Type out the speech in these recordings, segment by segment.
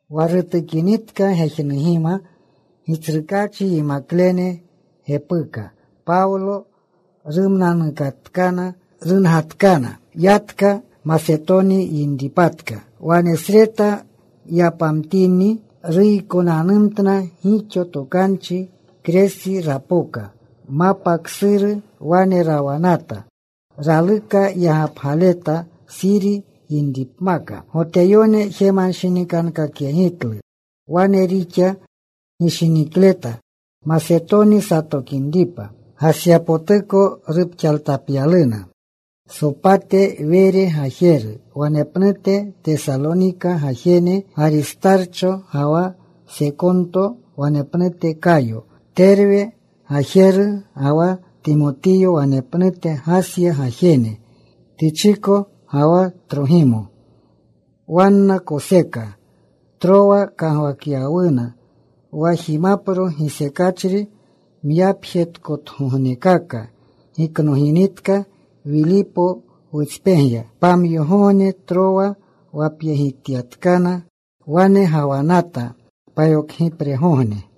Wa rutukinitka gejnugima Gitsrukaachi yimaklene repuka Pawlo. Rumnanukatkana. Rungatkana. Yatka. Masetoni yinripatka. Wanesreta yapamtini, ruykonanumtna gixo tokanchi. Kresi rapoka. Mapa ksuru wane rawanata. Raluka yagapgaleta, Suri yinripmaka. Goteyone jemanshinikankakyegitlu. Wane rixa gishinikleta Masetoni satokinripa. Gasyapotuko rupxaaltapyaluna Sopate Were gajeru, wanepnute Tesalonika gajene Garistarcho ga wa Sekonto, wanepnute Kayo, Terwe gajeru, ga wa Timotiyo; wanepnute Gasya gajene, Tichiko ga wa Trogimo. Wanna koseka. Trowa kagwakyawuna. Wa jimapro gisekachri myapjetkotugognekaka giknoginitka, Wilipo wutspegya. Pamyogogne Trowa wapyegityatkana. Wane gawanata payokgipregogne.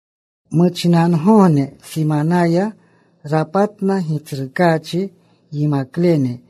Muchinangogne simanaya, rapatna Gitsrukaachi yimaklene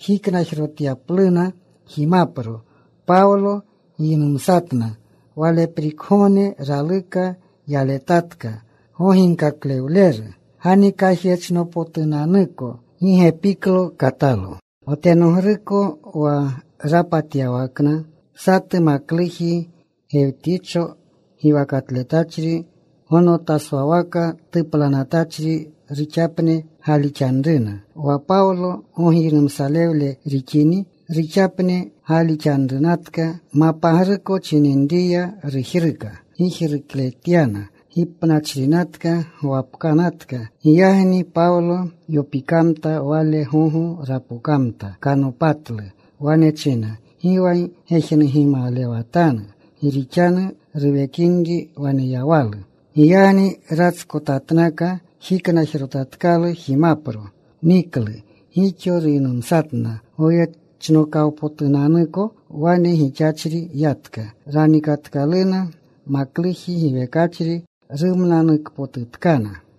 jiknajrotyapluna jimapro. Pawlo giynumsatna. Waleprikgogne raluka yaletatka. Goginkaklewleru ganikajyechnopotunanuko. Gi gepiklo katalo wa tenogruko wa rapatyawakna. Satu makluji Gewticho giwakatletachri gonotaswawaka tuplanatachri. Ruxapne gaalixanruna. Wa Pawlo gogiynumsalewle rixini, ruxapne gaalixanrunatka. Mapagruko chininriya ruyaka gijrukletyana. Gipnachrinatka gwapkanatka. Giyagni Pawlo yopikamta. Wale gogo rapokamta. Kanopatlu. Wane china, “Gi wa gejnugimalewatanu. Gi rixanu ruwekinri waneyawalu.” Giyagni ratskotatnaka. Jiknajrotatkalu jimapro. Niklu. Gixo ruynumsatna goyechnokawpotunanuko. Wane gixachri yatka. Ranikatkaluna makluji giwekachri. Rumnanukpotutkana.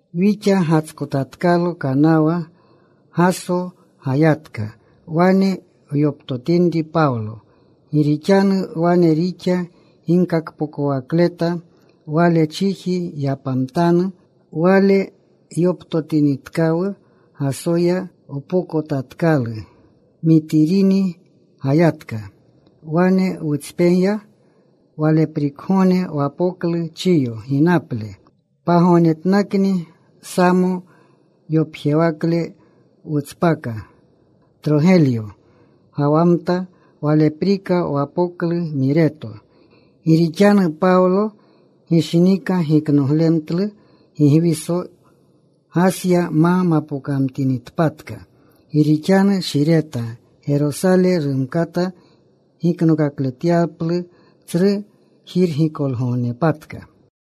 Wixa gatskotatkalo kanawa. Gaso gayatka. Wane wyoptotinri Pawlo. Gi rixanu wane rixa ginkakpokowakleta. Wale chiji yapamtanu. Wale yoptotinitkawu Gasoya. Wpokotatkalu. Mitirini gayatka. Wane wutspegya. Waleprikgogne wapoklu Chiyo ginaple. Pagognetnakni Samo yopjewakle wutspaka. Trogelyo gawamta. Waleprika wapoklu Mireto. Gi rixanu Pawlo gishinika giknoglemtlu Gigwiso, Gasya ma mamginitpatka. Gi rixanu shireta Gerosale rumkata giknokakletyaplu Tsru Jirgikolgognepatka.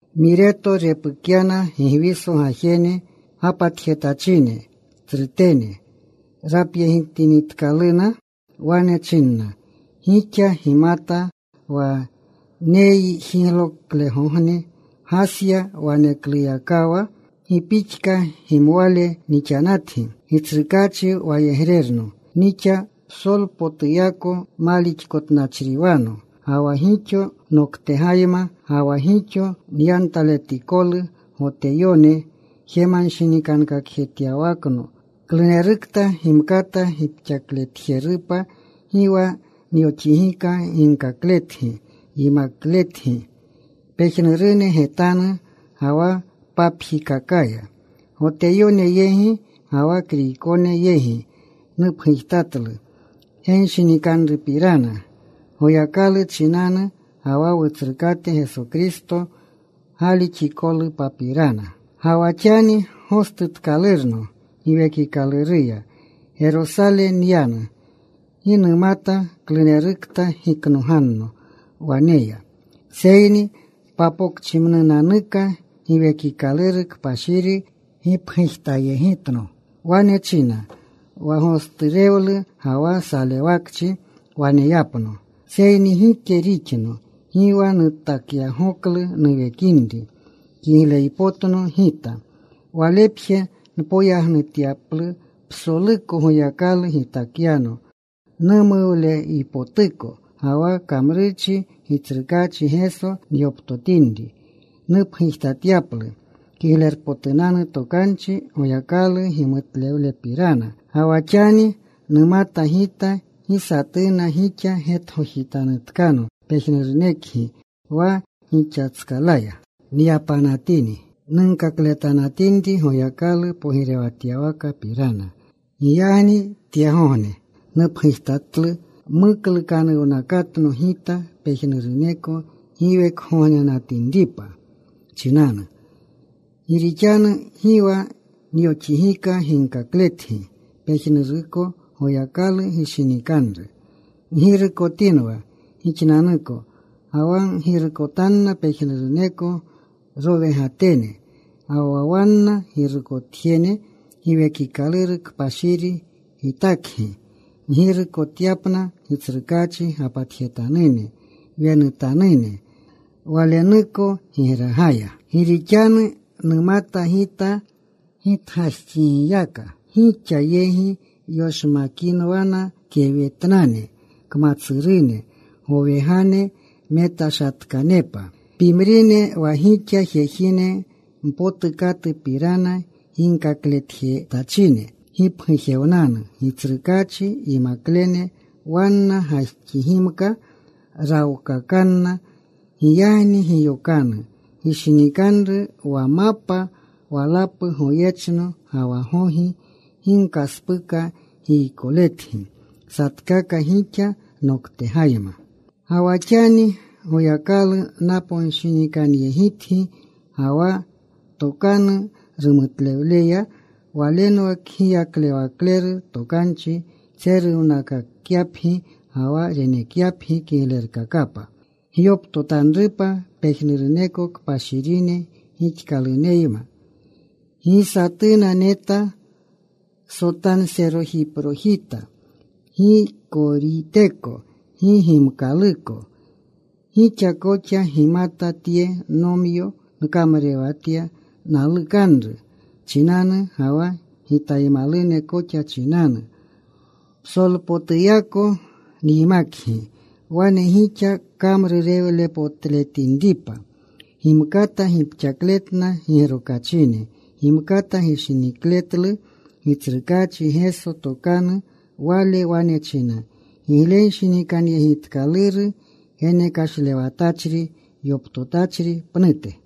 Mireto repukyana Gigwiso gajene gapatjetachine tsrutene. Rapyegitinitkaluna, wane chinna, “Gixa gimata wa nejigloklegogne Gasya wanekluyakawa, gi pixka gimwale nixanatgi. Gitsrukaachi wayegrerno nixa. Psolpotuyako malixkotnachriwano. Ga wa gixo noktegayma. Ga wa gixo nyantaletikolu Goteyone jemanshinikankakjetyawakno. Klunerukta gimkata gipxakjerupa gi wa nyoxigika ginkakletgi yimakletgi pejnurune getanu ga wa papjikakaya. Goteyone yegi ga wa Kriykone yegi nupgujtatlu genshinikanrupirana Goyakalu chinanu, ga wa Wutsrukate Geso Kristo galixikolupapirana. “Ga wa xani gostutkalurno Giwekikaluruya, Gerosale nyanu. Gi numata klunerukta giknoganno waneya. Seyni papokchimnunanuka Giwekikaluru Kpashiri gipgujtayegitno. Wane china wa gosturewlu ga wa salewakchi waneyapno. Seyni gike rixno. Gi wa nutakyagoklu nuwekinri kigleypotno gita. Walepje, npoyagkakyaplu psoluko Goyakalu gitakyano numuwleypotuko, ga wa kamrurchi Gitsrukaachi Geso nyoptotinri, nupgujtatyaplu Kiglerpotunanu Tokanchi Goyakalu gimutlewlepirana. “Ga wa xani, numata gita gi satuna gixa getgojitanutkano, pejnurunekgi wa gixatskalaya nyapanatini, nunkakletanatinri Goyakalu pogirewatyawakapirana. Giyagni tyegogne nupgujtatlu muklukanuwnakatno gita pejnuruneko giwekgognenatinripa chinanu. Gi rixanu gi wa nyoxigika ginkakletgi pejnuruko Goyakalu gishinikanru. Ggirukotinwa gixnanuko, ga wa ggirukotanna pejnuruneko rowegatene. Wa wanna girukotjene Giwekikaluru Kpashiri gitakgi, ggirukotuyapna Gitsrukaachi gapatjetanune, wenutanune Walenuko gigragaya. Gi rixanu numata gita, gitgajxigiyaka gixa yegi yoshmakinwana kewetnane kmatsurune, gowegane metashatkanepa. Pimrine wa gixa, jejine mpotukatupirana ginkakletjetachine gipgujewnanu. Gitsrukaachi yimaklene wanna gajxigimka rawkakanna. Giyagni giyokanu. Gishinikanru wa mapa walapu goyechno ga wa gogi gi nkaspuka giykoletgi satkaka gixa noktegayma. “Ga wa xani Goyakalu naponshinikanyegitgi, ga wa tokanu rumutlewleya. Walenwa kgiyaklewakleru tokanchi, tseruwakyapgi, ga wa renekyapgi kiglerkakapa gyoptotanrupa pejnuruneko kpashirine gixkaluneyma. Gi satuna neta sotanserojipjojita, gi koriteko, gi gimkaluko. Gixa koxa gimata tye nomyo nkamrurewatya nalukanru chinanu ga wa gitaymalune koxa chinanu. Psolpotuyako nyimakgi, wane gixa kamrurewlepotletinripa gimkata gipxakletna gigrokachine. Gimkata gishinikletlu Gitsrukaachi Geso tokanu. Wale wane china, ‘Giglenshinikanyegitkaluru geneklewashatachri yoptotachri pnute.’”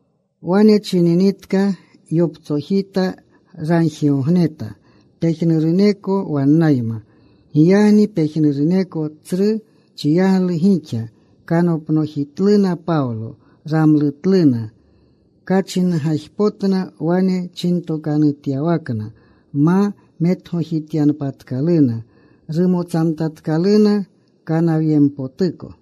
Wane chininitka, yoptsojita. Ragjigogneta pejnuruneko wannayma. Giyagni pejnuruneko tsru chiyaglu gixa. Kanopnojitluna Pawlo. Ramlutluna. Kachingajpotna wane chintokanutyawakna ma metgojityanpatkaluna. Rumotsamtatkaluna kanawyempotuko.